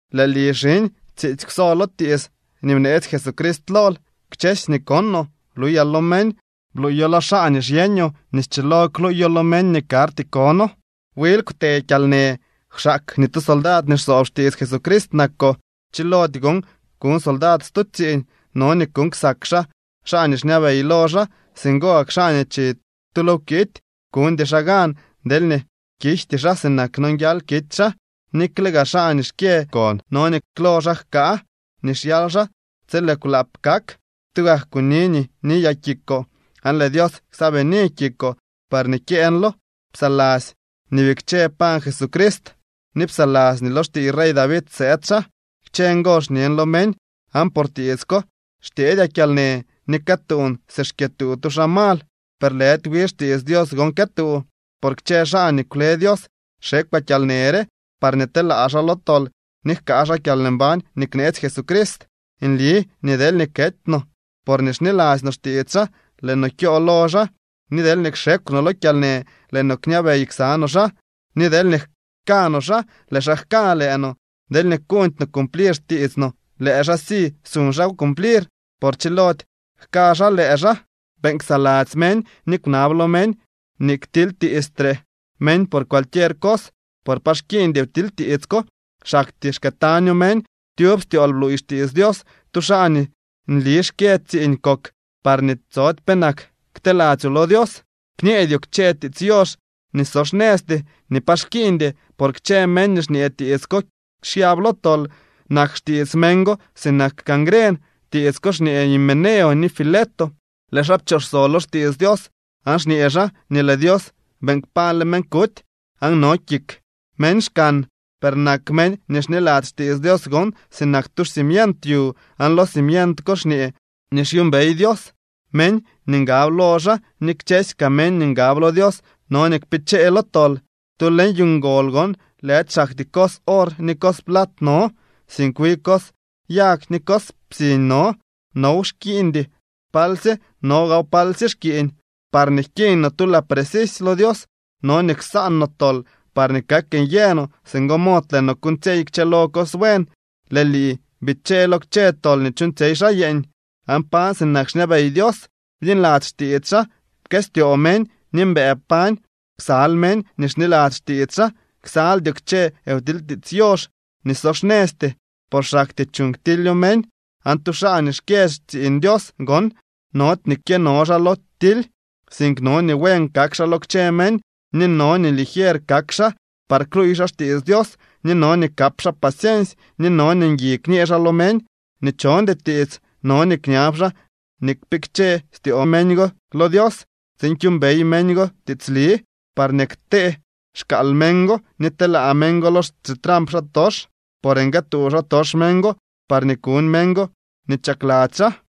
Lëë lii, xiñ, tsiitsy kwso lo tiits nii bneetsy Jesucrist lool. Kchësy nii konoo bluyaa lo meñ, bluuyo lo xaa nii xyeñoo nii schilo kluuyo lo meñ nii karty kono. Wil kwte kyalnë, kwxaak nii tu soldad nii xsoob xtiits Jesucrist nakoo. Chilody gon kuñ soldad stu tsiiñ. No nii kuuñ ksak xaa xaa nii xñabey lo xaa. Singo gak xaa nii chi tu lo wkity kuñdy xaa gan deelñee kijty xaa sinak nonguial kity xaa. Nikle gaa xaa nii xkyë kon no nii klo xaa jkaa nii xyal xaa tsi lëë kwlaap kak. Tugak kuni nii niyaa kikoo, aan lëë Dios ksaabini kikoo parñee kyeeñlo. Psaladzy nii bikche kpañ Jesucrist ni psaladzy nii lo xtiiy rey David sëëd xaa. Kchë ngo xñen lo meñ. Aan por tiits ko xtyeedyaa kyalnë, ni këtuun si xkyëtuu tu xaa mal. Per lëdy wi xtiits Dios gon këtuu. Por kchë xaa nii kwle Dios xekwaa kyalnë re parñee telaa xaa lo tol ni jkaa xaa kyalmbañ nii kneetsy Jesucrist: Nli nii deelñee kety no porñee xniladzy no xtiits xaa, lëë no kyoo lo xaa, ni deelñee kxekw no lo kyalnë, lëë no kñabey ksa no xaa, ni deelñee jka no xaa, lëë xaa jka lëë no. Deelñee kuuñdy no cumplir xtiits no, lëë xaa si suñ xaaw cumplir, por chilody jka xaa lëë xaa. Beeñ ksaladzy meñ ni kwnab lo meñ nii ktilytiistre meñ por cualquier cos por pa xkiiñdy wtilytiits ko. Xaktyee xkëëtaño meñ. Tyub styool bluuy xtiits Dios. Tu xaa nii nli xkyë tsiiñ kok parñee tsody penak kteladzyoo lo Dios. Kñeedyoo kchë tiits yox nii so xnëzty ni pa xkiiñdy, por kchë meñ nii xñee tiits ko xyab lo tol. Nak xtiits meñ go sinak cangren. Tiits ko xñee Himeneo ni Fileto. Lëë xaa pchooxso lo xtiits Dios aan xñee xaa nii lëë Dios beeñ kpañle meñ kuty aan no kik meñ xkan. Per nak meñ nii xniladzy xtiits Dios gon sinak tu xcimient yu, aan lo cimient ko xñee nii xyuumbey Dios meñ nii ngab lo xaa, ni kchësy kaa meñ nii ngab lo Dios no nii kpichee lo tol. Tu leñ yu ngol gon, lëdy xaktyee cos or ni cos plat no, sink wi cos yag ni cos psiñ no. Now xkiiñdy palsye no gaaw palsye xkiiñ. Parñee jkiiñ no tu laa precisy lo Dios, no nii ksaan no tol parñee kak nyë no, singo mod lëë no kuuñtsyey kchëlo cos buen. Lëë lii, bichee lo kchë tol nii chuuñtsyey xaa yeeñ, aan pañ sinak xñabey Dios, bniladzy xtiits xaa, pkëstyoo meñ ni mbëë pañ ksal meñ nii xniladzy xtiits xaa. Ksaldyoo kchë wtilytiits yox nii so xnëzty por xaktyee chuuñ ktilyo meñ. Aan tu xaa nii xkyë xtsiiñ Dios gon nody nii kyëno xaa lo tily, sink no nii buen kak xaa lo kchë meñ, ni no nii ligier kak xaa par kluuy xaa xtiits Dios, ni no nii kap xaa paciensy ni no nii ngui kñee xaa lo meñ nii chondy tiits. No nii kñab xaa nii kpikche styoo meñ go lo Dios tsiin kyuumbey meñ go tiitsli, parñee kte xkaal meñ go ni telaa meñ go lo xitramp xaatox, por nguëëtuu xaatox meñ go parñee kuñ meñ go nii chakladzy xaa.